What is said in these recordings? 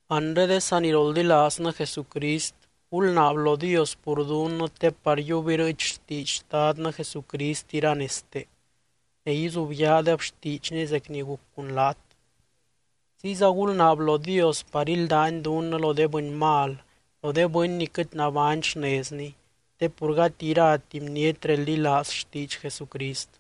Anre de saniroldilaaznɨ Jesucrist, gulnaab lo Dios pur dunnɨ te par yiub irɨɨch xtiidx Xtadnɨ Jesucrist iranezte, ne izubyaadeb xtiidxny zec ni guc cun laat. Ziyza gulnaab lo Dios par íldany dunnɨ lo de bɨny mal, lo de bɨny ni quɨt nabány xnezni, te pur gati irati bniety reldilaaz xtiidx Jesucrist.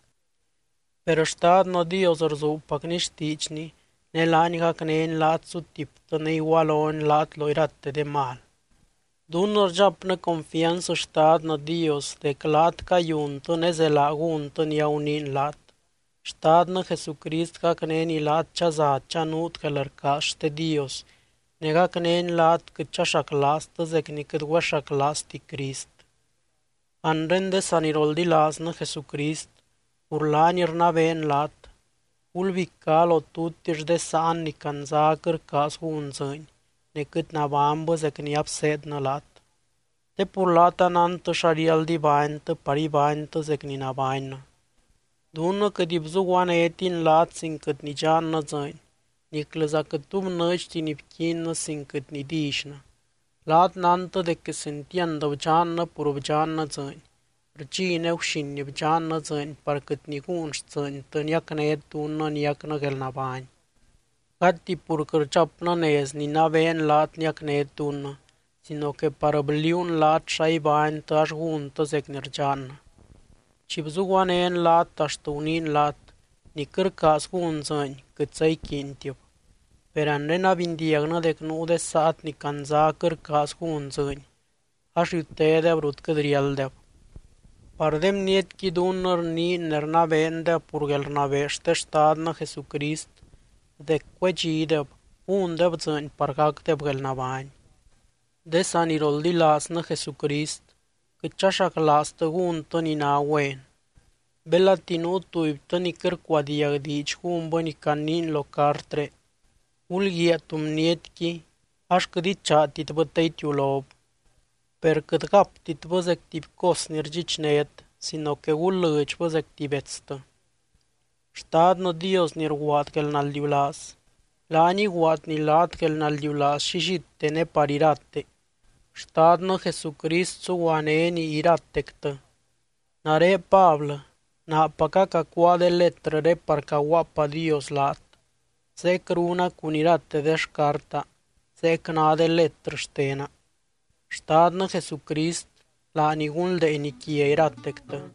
Per Xtadnɨ Dios rzuubpacny xtiidxny, ne laany gacnény laat sutiptɨ ne igualony laat lo irate de mal. Dunnɨ rdxapnɨ confianz Xtadnɨ Dios dec laat cayuntɨ ne zelaa gúntɨ ni aguniin laat. Xtadnɨ Jesucrist gacnény laat chaza chanuut guelrcaaz xte Dios, ne gacnény laat quɨt chaxaclaaztɨ zec ni quɨt güexaclaazti Crist. Anre de saniroldilaaznɨ Jesucrist, pur laany rnabeen laat: Gulbicá lo tutix de sáan ni candzá quɨt rcaaz gún dzɨɨny, ne quɨt nabánybɨ zec ni abseednɨ laat. Te pur laat anántɨ xa riáld ibánytɨ par ibánytɨ zec ni nabánnɨ. Dunnɨ quɨt bzuguanétin laat sin quɨt nidxannɨ dzɨɨny, niclɨza quɨt tu bnɨɨdxti ni bquiinnɨ sin quɨt nidillynɨ. Laat nántɨ dec quesentiand bdxannɨ pur bdxannɨ dzɨɨny, rdxi ne guxin bdxannɨ dzɨɨny par quɨt niguun xtsɨɨntɨ niacnét dunnɨ niacnɨ guelnabány. Gati pur quɨt rdxapnɨ nez ninabeen laat niacnét dunnɨ, sino que par bliuun laat xa ibánytɨ ax gúntɨ zec ni rdxannɨ. Chi bzuguanén laat axt guniin laat: Ni quɨt rcaaz gún dzɨɨny, quɨtza iquiintib. Per anre abindiagnɨ dec nuu de saat ni candzá quɨt rcaaz gún dzɨɨny, ax riutédeb rut quɨt riálddeb. Par de bnietqui dunnɨ rniin ne rnabeendeb pur guelrnabee xte Xtadnɨ Jesucrist dec cuedxideb, gúndeb dzɨɨny par gacdeb guelnabány. De saniroldilaaznɨ Jesucrist, quɨt chaxaclaaztɨ gúntɨ ni ná güen. Belati nuu tubytɨ ni quɨt rcuadiag diidx gúnbɨ ni caniin lo cartré, gulguiaa tú bnietqui ax quɨt ichaatitbɨ te itiulob. Per quɨt gaptitbɨ zec tuby cos ni rdxichnét, sino que gul lɨdxbɨ zec tuby betstɨ. Xtadnɨ Dios ni rguaad guelnaldiulaaz, laany iguaadny laat guelnaldiulaaz llillite ne par irate. Xtadnɨ Jesucrist suguanény iratectɨ. Nare Pablɨ, naapaca cacuáa de letrɨré par caguaapadios laat. Zeec runa cun irate de xcarta, zeec ná de letrɨ xtena. Xtadnɨ Jesucrist, laany gunldeeny quia iratectɨ. Amén.